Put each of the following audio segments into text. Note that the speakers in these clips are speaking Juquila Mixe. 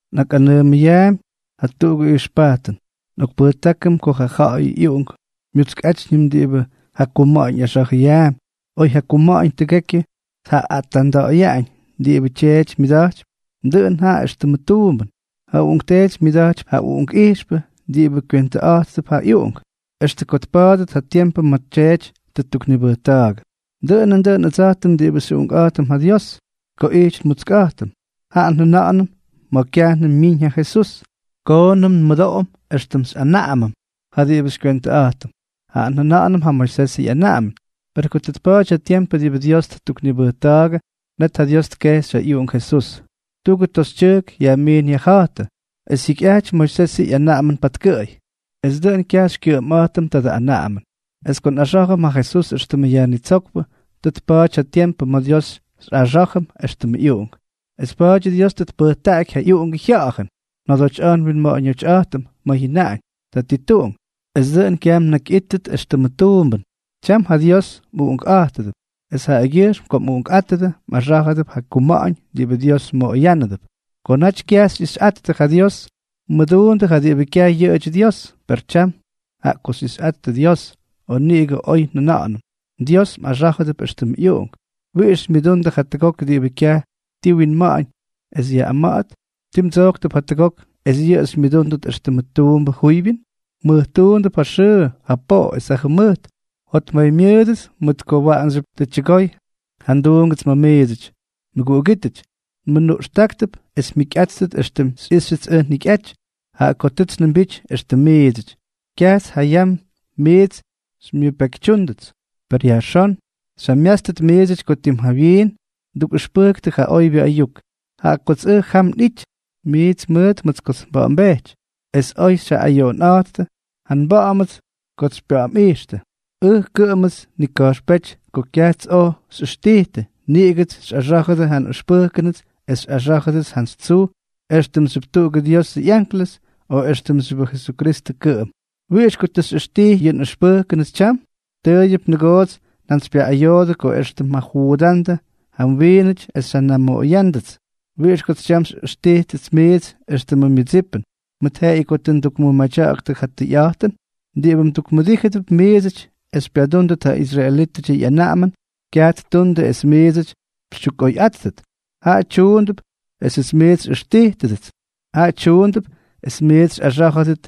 Nꞌakꞌanʉʉmʉyaampy jatuꞌugʉ ijxpajtʉn: Nꞌokpʉjtákʉm ko ja ja̱ꞌa̱yʉ ꞌyuꞌunk mutskátyñʉm diꞌibʉ ja kuma̱ꞌa̱ñ ꞌyaxa̱jʉyaampy, oy ja kuma̱ꞌa̱ñ tʉgekyʉ tjajaꞌaꞌa̱jtta̱ꞌa̱yaꞌañ diꞌibʉ tyeety myʉda̱jtypy, dʉꞌʉn jaꞌa éxtʉmʉ tuumbʉn. Ja uꞌunkteety myʉda̱jtypy ja uꞌunkꞌijxpʉ diꞌibʉ kywentʉꞌa̱jttʉp ja ꞌyuꞌunk, extʉ ko tpa̱a̱dʉt ja tiempʉ ma̱ ja tyeety tʉ ttuknibʉjta̱a̱gʉ. Dʉꞌʉn nandʉꞌʉn ʉdsa̱jtʉm diꞌibʉ xyꞌuꞌunkꞌa̱jtʉm ja Dios: ko ijty nmutskꞌa̱jtʉm, jaꞌa njʉna̱ꞌa̱nʉm ma̱ kyajnʉm myiñ ja Jesús, koonʉm nmʉmʉdoꞌom éxtʉm xyꞌanaꞌamʉm ja diꞌibʉ xykywentʉꞌa̱jtʉm, jaꞌa njʉna̱ꞌa̱nʉm ja Moisesʉ ꞌyanaꞌamʉn. Per ko tʉ tpa̱a̱ty ja tiempʉ diꞌibʉ Dios tʉ ttuknibʉjta̱a̱gʉ, net ja Dios tkejxy ja ꞌyUꞌunk Jesús, tuꞌugʉ toxytyʉjk yajmiin yajja̱jtʉ, es jyikyꞌajty Moisesʉ ꞌyanaꞌamʉn patkʉꞌʉy, es dʉꞌʉn kyaj xykyʉꞌʉmꞌa̱jtʉm tadʉ anaꞌamʉn. Es ko nꞌaxá̱jʉm ja Jesús éxtʉmʉ Yajnitsókpʉ, tʉ tpa̱a̱ty ja tiempʉ ma̱ Dios xyꞌaxá̱jʉm éxtʉmʉ ꞌyuꞌunk. Es pa̱a̱dyʉ Dios tʉ tpʉjtaꞌaky ja ꞌyUꞌungʉ Jya̱ꞌa̱jʉn njodotyꞌa̱jtʉm nwinma̱ꞌa̱ñotyꞌa̱jtʉm ma̱ jyʉnaꞌañ: “Tatituꞌunk.” Es dʉꞌʉn kyaj mnakyꞌítʉt éxtʉmʉ tuumbʉn, tyam ja Dios mꞌuꞌunkꞌa̱jtʉdʉp; es jaꞌagyʉjxm ko mꞌuꞌunkꞌátʉdʉ, mꞌaxá̱jʉdʉp ja kuma̱ꞌa̱ñ diꞌibʉ Dios mmoꞌoyánʉdʉp. Ko naty kyaj xyꞌixyꞌattʉ ja Dios, mmʉduundʉ ja diꞌibʉ kyaj yʉꞌʉdyʉ Dios. Per tyam, jaꞌa ko xyꞌixyꞌattʉ Dios, o niꞌigʉ oy njʉna̱ꞌa̱nʉm, Dios mꞌaxá̱jʉdʉp éxtʉmʉ ꞌyuꞌunk, ¿wiꞌix xymyʉdundʉ jatʉgok diꞌibʉ kyaj ti wyaꞌañ es yaꞌꞌama̱ꞌa̱t? ¿Ti mdsojktʉp jatʉgok es yʉꞌʉ xymyʉdúndʉt éxtʉmʉ tuumbʉ juybyʉn? Mmʉjtuundʉp ja xʉʉ, ja poꞌo es ja jʉmʉjt. Jotmaymyʉʉdʉts mʉt ko waꞌanxyʉp tʉ tyʉgoy ja nduungʉts ma̱ miidsʉty. Mʉguꞌugítʉty, nmʉnuꞌxtáktʉp es mjikyꞌátʉt éxtʉm xyꞌíxyʉts ʉj njikyꞌaty, jaꞌa ko tʉts njʉmbity éxtʉm miidsʉty. Kyajts ja yam miits xymyʉpekytyúndʉts. Pes yajxón xyjamyátstʉt miidsʉty ko tim jawyiin ndukꞌʉxpʉjktʉ ja oybyʉ ayuk, jaꞌa kots ʉj jam nꞌijty miits mʉʉt mʉt kots nba̱ꞌa̱mbejty. Es oy xyjaꞌꞌayoꞌonꞌa̱jttʉ ja nba̱ꞌa̱mʉts kots xypya̱ꞌa̱mꞌijxtʉ, ʉj kʉꞌʉmts nnika̱jxpéty ko kyajts oj xyꞌʉxtijtʉ, niꞌigʉts xyꞌaxá̱jʉdʉ ja nꞌʉxpʉjkʉnʉts es xyꞌaxá̱jʉdʉts jantsy tsuj éxtʉmxyʉp tuꞌugʉ Diosʉ ꞌyanklʉs o éxtʉmxyʉbʉ Jesukristʉ kʉꞌʉm. ¿Wiꞌix ko tʉ xyꞌʉxtijtʉ yʉ nꞌʉxpʉjkʉnʉts tyam? Tʉʉyʉp nʉgoots xyjantsypyaꞌꞌayoodʉ, ko extʉ mjajuudándʉ ja mwiinʉty es xyjanamoꞌoyándʉts. ¿Wiꞌix kots tyam xyꞌíxtʉts miits éxtʉmʉ mmʉdsipʉn, mʉt jeꞌeyʉ ko tʉ ndukmʉmadya̱ꞌa̱ktʉ ja tʉyꞌa̱jtʉn? Diꞌibʉ mdukmʉdíjʉdʉp miidsʉty es xypyadúndʉt ja israelítʉdyʉ ꞌyanaꞌamʉn, kyaj ttundʉ es miits xytyukꞌoyꞌáttʉt, jaꞌa tyuundʉp esʉts miits xyꞌʉxtijtʉdʉts, jaꞌa tyuundʉp es miits xyꞌaxá̱jʉdʉt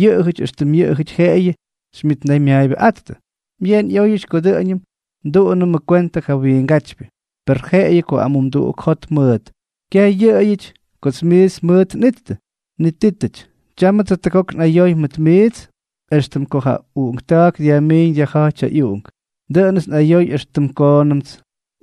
yʉꞌʉjʉty éxtʉm yʉꞌʉjʉty jeꞌeyʉ xymyʉtnaymyaayʉbʉꞌáttʉ. Byeen ꞌyóyʉty ko dʉꞌʉñʉm nduꞌunʉmʉ kwentʉ ja wiingátypyʉ; per jeꞌeyʉ ko amumduꞌuk jot mʉʉt, kyaj yʉꞌʉyʉty kots miits mʉʉt nꞌittʉ. Nitítʉty, tyámʉts jatʉgok nꞌayoy mʉt miits éxtʉm ko ja uꞌunkta̱a̱k dyajmíñ dyajja̱ꞌty ja ꞌyuꞌunk. Dʉꞌʉnʉts nꞌayoy extʉ koonʉmts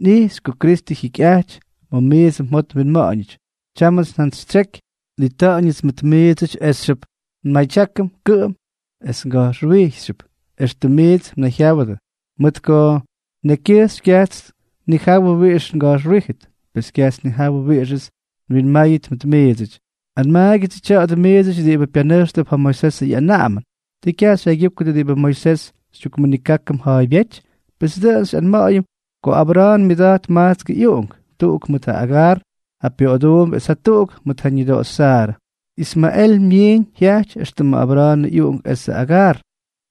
nꞌixy ko Kristʉ jyikyꞌaty ma̱ miidsʉ mjot mwinma̱ꞌa̱ñʉty. Tyámʉts njantsyjyatseky nꞌita̱ꞌa̱ñʉts mʉt miidsʉty esxyʉp nmadyákʉm kʉꞌʉm es nga̱jxwijxyʉp éxtʉm miits mnayjyáwʉdʉ, mʉt ko nekykyʉjxy kyajts nnijawʉ wiꞌix nga̱jxwijtʉt, pes, kyajts nnijawʉ wiꞌixʉts nwinmáyʉt mʉt miidsʉty. Anmaagyʉdsʉ tya̱a̱dʉ miidsʉty diꞌibʉ pyanʉjxtʉp ja Moisés ꞌyanaꞌamʉn, ¿Tii kyaj xyjaygyúkʉdʉ diꞌibʉ Moisés xytyukmʉnikákʉm ja̱a̱ybyéty? Pes dʉꞌʉn xyꞌanma̱ꞌa̱yʉm ko Abra̱a̱n myʉda̱jt majtskʉ ꞌyuꞌunk: tuꞌuk mʉt ja Agar, ja pyoꞌoduumbʉ, es jatuꞌuk mʉt ja ñʉdoꞌoxy Saarʉ. Ismaꞌel myiñ jyajty éxtʉmʉ Abra̱a̱nʉ ꞌyuꞌunk esʉ Agar.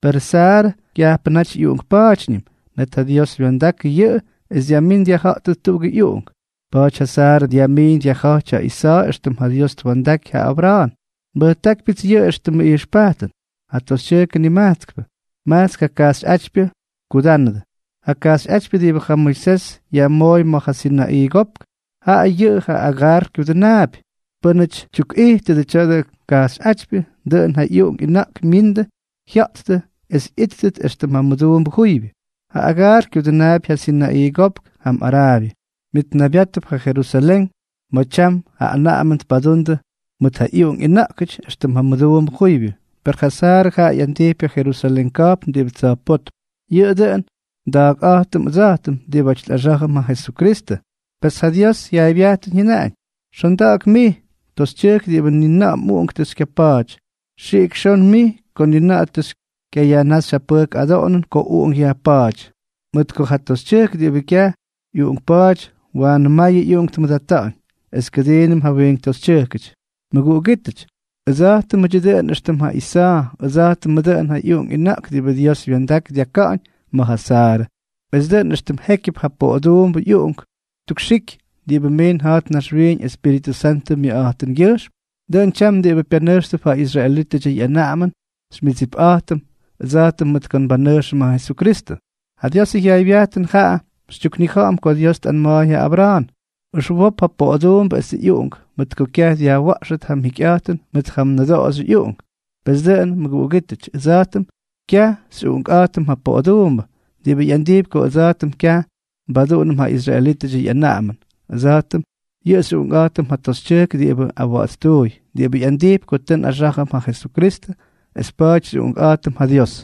Perʉ Saarʉ kyajpʉ naty ꞌyuꞌunkpa̱a̱tyñʉm, net ja Dios wya̱ndakʉ yʉꞌʉ es dyajmín dyajja̱ꞌtʉt tuꞌugʉ ꞌyuꞌunk. Pa̱a̱ty ja Saarʉ dyajmiiñ dyajja̱jty ja Isa̱a̱ éxtʉm ja Dios twa̱ndaky ja Abra̱a̱n. Nbʉjtákypyʉts yʉꞌʉ éxtʉmʉ ijxpajtʉn. Ja toxytyʉjkʉ nimajtskpʉ, majtsk ja kajxyꞌátypyʉ tkudánʉdʉ: ja kajxyꞌátypyʉ diꞌibʉ ja Moisés yajmooy ma̱ ja Sinaꞌii Kopk, jaꞌa yʉꞌʉ ja Agar kyudʉnaapy. Pʉ́nʉty tyukꞌijtʉdʉbʉ tya̱dʉ kajxyꞌátypyʉ, dʉꞌʉn ja ꞌyuꞌunk ꞌyʉna̱ꞌk myindʉ jya̱ꞌttʉ es ꞌyíttʉt éxtʉm ja mʉduumbʉ juybyʉ. Ja Agar kyudʉnaapy ja Sinaꞌii Kopk jam Araabyʉ, myʉtnaybyátʉp ja Jerusalén, ma̱ tyam ja anaꞌamʉn tpadundʉ mʉt ja ꞌyuꞌunk ꞌyʉna̱ꞌkʉty éxtʉm ja mʉduumbʉ juybyʉ. Per ja Saarʉ jaꞌa ꞌyandijpy ja Jerusalén ka̱jpn diꞌibʉ tsa̱jpótm. Yʉꞌʉ dʉꞌʉn nda̱a̱kꞌa̱jtʉm ʉdsa̱jtʉm diꞌibáty nꞌaxá̱jʉm ja Jesukristʉ. Pes ja Diosʉ jyaaybyajtʉn jyʉnaꞌañ: Xonda̱ꞌa̱k mij, toxytyʉjk diꞌibʉ ni na̱ꞌa̱ mꞌuꞌunk tʉ xykyapa̱a̱ty; xiꞌik xon mij ko ni na̱ꞌa̱ tʉ xykyayajnáxy ja pʉjk adoꞌonʉn ko uꞌunk yajpa̱a̱ty. Mʉt ko ja toxytyʉjk diꞌibʉ kyaj ꞌyuꞌunkpa̱a̱ty, waanʉ mayʉ ꞌyuꞌunk tmʉdata̱ꞌa̱ñ es kʉdiinʉm ja wiink toxytyʉjkʉty. Mʉguꞌugítʉty, ʉdsa̱jtʉmʉdyʉ dʉꞌʉn éxtʉm ja Isa̱a̱, ʉdsa̱jtʉmʉ dʉꞌʉn ja uꞌunk ʉna̱ꞌk diꞌibʉ Dios wya̱ndak dyaka̱ꞌa̱ñ ma̱ ja Saarʉ. Es dʉꞌʉn éxtʉm jékyʉp ja poꞌoduumbʉ ꞌyuꞌunk ttukxiky diꞌibʉ miin ja̱jt naxwiiñ Espíritʉ Santʉ myʉkꞌa̱jtʉngyʉjxm, dʉꞌʉn tyam diꞌibʉ pyanʉjxtʉp ja israelítʉdyʉ ꞌyanaꞌamʉn xymyʉdsipꞌa̱jtʉm ʉdsa̱jtʉm mʉt ko mbanʉjxʉm ja Jesukristʉ. Ja Diosʉ jyaaybyajtʉn jaꞌa xytyuknija̱ꞌa̱m ko Dios tꞌanma̱a̱y ja Abra̱a̱n: “Ʉxwop ja poꞌoduumbʉ esʉ ꞌyuꞌunk, mʉt ko kyaj dyajwa̱ꞌxʉt ja mjikyꞌa̱jtʉn mʉt ja mnʉdoꞌoxyʉ ꞌyuꞌunk.” Pes dʉꞌʉn, mʉguꞌugítʉty, ʉdsa̱jtʉm kyaj xyꞌuꞌunkꞌa̱jtʉm ja poꞌoduumbʉ, diꞌibʉ ꞌyandijpy ko ʉdsa̱jtʉm kyaj nbaduꞌunʉm ja israelítʉdyʉ ꞌyanaꞌamʉn. Ʉdsa̱jtʉm yʉꞌʉ xyꞌuꞌunkꞌa̱jtʉm ja toxytyʉjk diꞌibʉ awa̱ꞌa̱tstuuy, diꞌibʉ ꞌyandijpy ko tʉ nꞌaxá̱jʉm ja Jesukristʉ es pa̱a̱ty xyꞌuꞌunkꞌa̱jtʉm ja Dios.